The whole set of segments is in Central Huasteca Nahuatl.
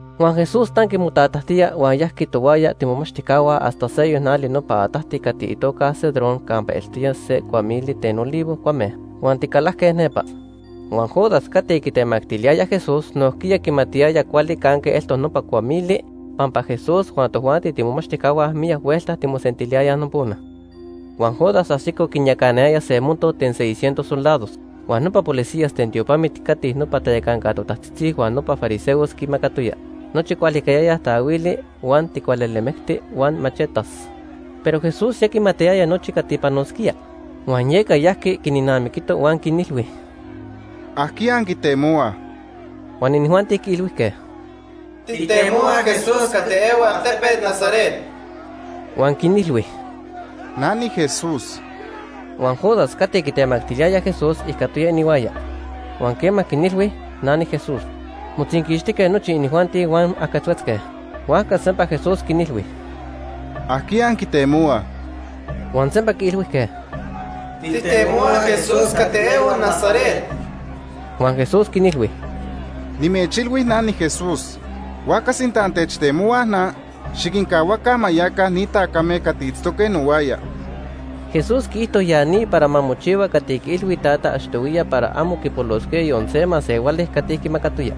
Huan Jesús tanqui motatajtía huan yajqui tohuaya tiimomachtijcahua hasta seyoc nali nopa atajti cati itoca Cedrón campa eltoya se cuamili ten olivo cuame. Huan ticalajque nepa. Huan Judas cati quitemactiliyaya Jesús nojquiya quimatiyaya cuali canque eltoc nopa cuamili pampa Jesús huan tojuanti tiimomachtijcahua miyac huelta timosentiliyayaj nopona. Huan Judas ajsico quinyacanayaya se monto ten seis cientos soldados huan nopa policías ten tiopamit cati nopa tayacanca totajtzitzi huan nopa fariseos quimacatoyaj. Nochi quihualicayayaj taahuili, huan ticualelemecti huan machetas. Pero Jesús ya quimatiyaya nochi cati quipanosquía, huan yeca yajqui quinnamiquito huan quinilhui: ―¿Ajquiya anquitemohuaj? Huan inijuanti quiilhuijque: ―Tijtemohuaj Jesús cati ehua altepet Nazaret. Huan quinilhui: ―Na niJesús. Huan Judas cati quitemactiliyaya Jesús ijcatoya inihuaya. Huan quema quinilhui: “Na niJesús”, motzinquixtijque nochi inijuanti huan ajquetzhuetzque. Huajca sempa Jesús quinilhui: ―¿Ajquiya anquitemohuaj? Huan sempa quiilhuijque: ―Tijtemohuaj Jesús cati ehua Nazaret. Huan Jesús quinilhui: ―Nimechilhui na niJesús. Huajca sinta antechtemohuaj na, xiquincahuaca ma yaca ni tacame cati itztoque nohuaya. Jesús quiijto ya ni para ma mochihua cati quiilhui iTata achtohuiya para amo quipolosquía yon se masehuali cati quimacatoya.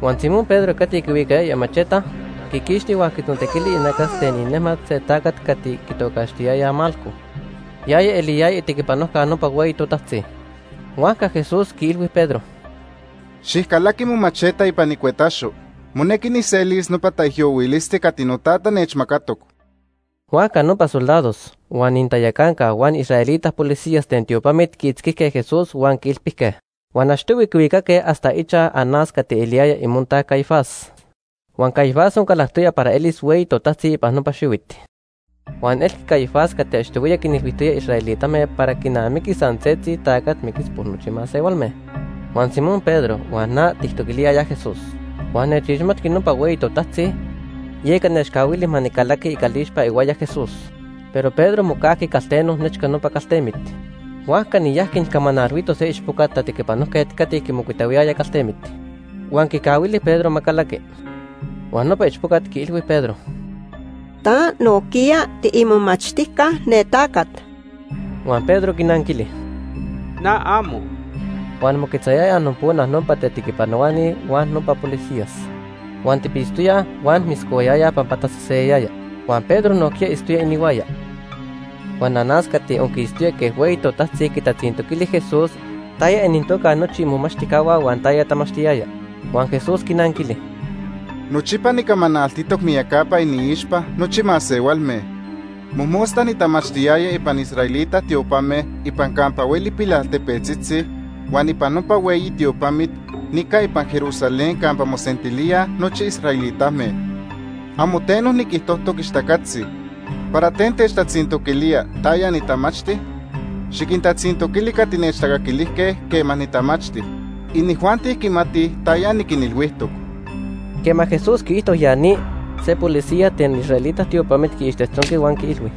Huan Simón Pedro cati quihuicayaya imacheta, quiquixti huan quitzontequili inacas ten inejmat se tacat cati quitocaxtiyayaj Malco. Yaya eliyaya itequipanojca nopa hueyi totajtzi. Huajca Jesús quiilhui Pedro: ―Xijcalaqui momacheta ipan icuetaxo. Monequi nijselis nopa taijyohuilisti cati noTata nechmacatoc. Huajca nopa soldados, huan inintayacanca huan israelita policías ten tiopamit quiitzquijque Jesús huan quiilpijque. Huan achtohui quihuicaque hasta ichaj Anás cati eliyaya imontaj Caifás. Huan Caifás oncalactoya para elis hueyi totajtzi ipan nopa xihuit. Huan elqui Caifás cati achtohuiya quinilhuijtoya israelitame para quinamiqui san setzi tacat miquis por nochi masehualme. Huan Simón Pedro huan na tijtoquiliyayaj Jesús. Huan nechixmati nopa hueyi totajtzi, yeca nechcahuili ma nicalaqui icalixpa ihuaya Jesús. Pero Pedro mocajqui calteno nechca nopa caltemit. Huajca niyajqui nijcamanalhuito se ichpoca tatequipanojquet cati quimocuitahuiyaya caltemit, huan quicahuili Pedro ma calaqui. Huan nopa ichpocat quiilhui Pedro: ―Ta nojquiya tiimomachtijca ne tacat. Huan Pedro quinanquili: ―Na, amo. Huan moquetzayayaj nopona nopa tatequipanohuani huan nopa policías. Huan tipitztoyaj huan moscohuayayaj pampa taseseyayaya. Huan Pedro nojquiya itztoya inihuaya. Huan Anás cati onquistoya quej hueyi totajtzi quitatzintoquili Jesús taya inintoca nochi imomachtijcahua huan taya tamachtiyaya. Huan Jesús quinanquili: ―Nochipa nicamanaltitoc miyacapa iniixpa nochi masehualme. Mojmosta nitamachtiyaya ipan israelita tiopame ipan campa hueli pilaltepetzitzi huan ipan nopa hueyi tiopamit nica ipan Jerusalén campa mosentilíaj nochi israelitame. Amo teno niquijtojtoc ixtacatzi. ¿Para ten techtatzintoquilía taya nitamachti? Xiquintatzintoquili cati nechtacaquilijque quema nitamachti. Inijuanti quimatij taya niquinilhuijtoc. Quema Jesús quiijto ya ni, se policía ten israelita tiopamit quiixtejtzonqui huan quiilhui: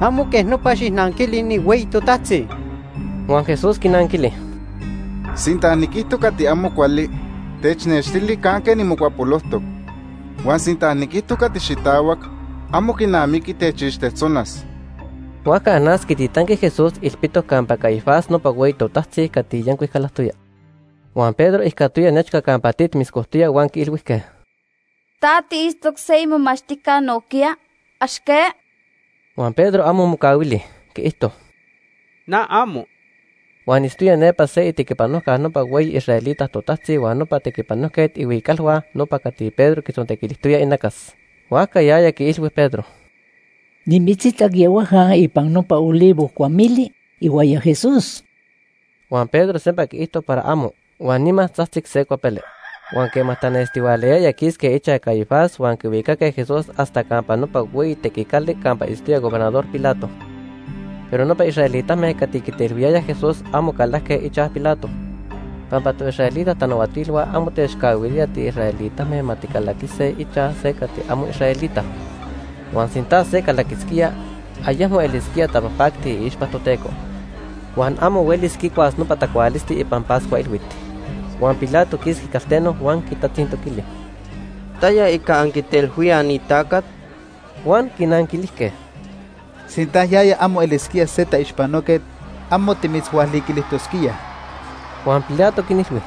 ―Amo quej nopa xijnanquili ni hueyi totajtzi. Huan Jesús quinanquili: ―Sinta niquijto cati amo cuali, technextili canque nimocuapolojtoc. Huan sinta niquijto cati xitahuac, amo quinamiqui techixtejtzonas. Huajca Anás quititanqui Jesús ilpitoc campa Caifás nopa hueyi totajtzi cati yancuic calactoya. Huan Pedro ijcatoya nechca campa tit moscojtoya huan quiilhuijque: ―Ta tiitztoc se imomachtijca nojquiya, ¿ax que? Huan Pedro amo mocahuili, quiijto: ―Na, amo. Huan itztoya nepa se itequipanojca nopa hueyi israelita totajtzi huan nopa tequipanojquet ihuicalhua nopa cati Pedro quitzontequilijtoya inacas. Huajca yaya quiilhui Pedro: ―Nimitzitac yehuaja ipan nopa olivo cuamili ihuaya Jesús. Huan Pedro sempa quiijto para amo, huan nima tzajtzic se cuapele. Huan quema tanestihualayaya quisque ichaj Caifás huan quihuicaque Jesús hasta campa nopa hueyi tequicali campa itztoya Gobernador Pilato. Pero nopa israelitame cati quitelhuiyayaj Jesús amo calajque ichaj Pilato, pampa toisraelita tanahuatilhua amo techcahuilía tiisraelitame ma ticalaquise ichaj se cati amo israelita. Huan sinta se calaquisquía, ayecmo elisquía tapajpacti iixpa Toteco, huan amo huelis quicuas nopa tacualisti ipan Pascua Ilhuit. Huan Pilato quisqui calteno huan quintatzintoquili: ―¿Taya ica anquitelhuíaj ni tacat? Huan quinanquilijque: ―Sinta yaya amo elisquía se taixpanoquet, amo timitzhualiquilijtosquíaj. Huan Pilato quinilhui: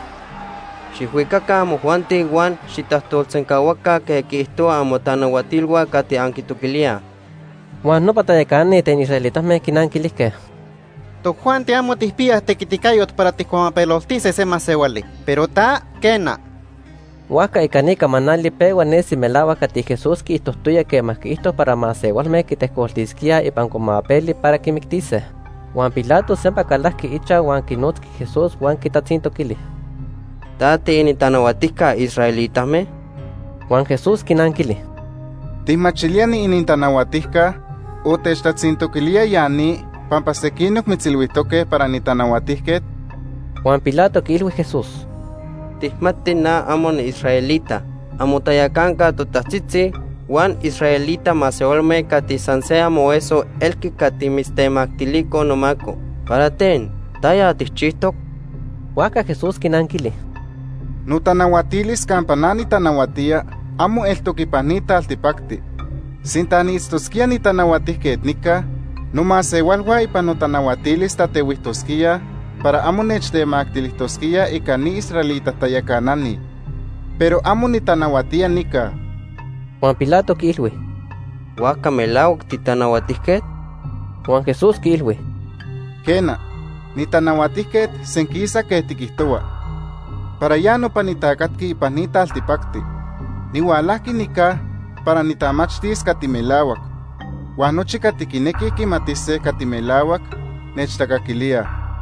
―Xijhuicaca amojuanti huan xijtajtolsencahuaca quej quiijtohuaj amotanahuatilhua cati anquitoquilíaj. Huan nopa tayacanani ten israelitame quinanquilijque: ―Tojuanti amo tijpiyaj tequiticayot para tijcuamapeloltise se masehuali, pero ta, quena. Huajca ica ni camanali pehua nesi melahuac cati Jesús quiijtojtoya quema quiijto para masehualme quitejcoltisquíaj ipan cuamapeli para quimictise. Huan Pilato sempa calajqui ichaj huan quinotzqui Jesús huan quitatzintoquili: ―¿Ta tiinintanahuatijca israelitame? Huan Jesús quinanquili: ―¿Tijmachilía niinintanahuatijca, o techtatzintoquilía ya ni pampa sequinoc mitzilhuijtoque para nitanahuatijquet? Huan Pilato quiilhui Jesús: ―Tijmati na amo niisraelita. Amotayacanca totajtzitzi huan israelita masehualme cati san se amoeso elque cati mitztemactilicoj nomaco. ¿Para ten? ¿Taya tijchijtoc? Huajca Jesús quinanquili: ―Notanahuatilis campa na nitanahuatía amo eltoc ipan ni taltipacti. Sinta niitztosquía nitanahuatijquet nica, nomasehualhua ipan notanahuatilis tatehuijtosquíaj para amo nechtemactilijtosquíaj ica ni israelita tayacanani. Pero amo nitanahuatía nica. Huan Pilato quiilhui: ―¿Huajca melahuac titanahuatijquet? Huan Jesús quiilhui: ―Quena, nitanahuatijquet senquisa quej tiquijtohua. Para ya nopa nitacatqui ipan ni taltipacti. Nihualajqui nica para nitamachtis cati melahuac, huan nochi cati quinequij quimatise cati melahuac nechtacaquilíaj.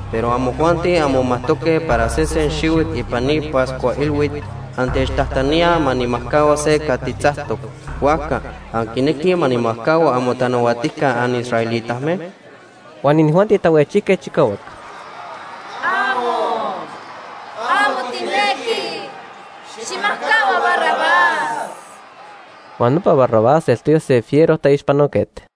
Pero amojuanti anmomajtoque para sesen xihuit ipan ni Pascua Ilhuit, antechtajtaníaj ma nijmajcahua se cati tzactoc. Huajca, ¿anquinequij ma nijmajcahua amotanahuatijca anisraelitame? Huan inijuanti tahuejchijque chicahuac: ―¡Amo! ¡Amo tijnequij! Xijmajcahua Barrabás. Huan nopa Barrabás eltoya se fiero taixpanoquet.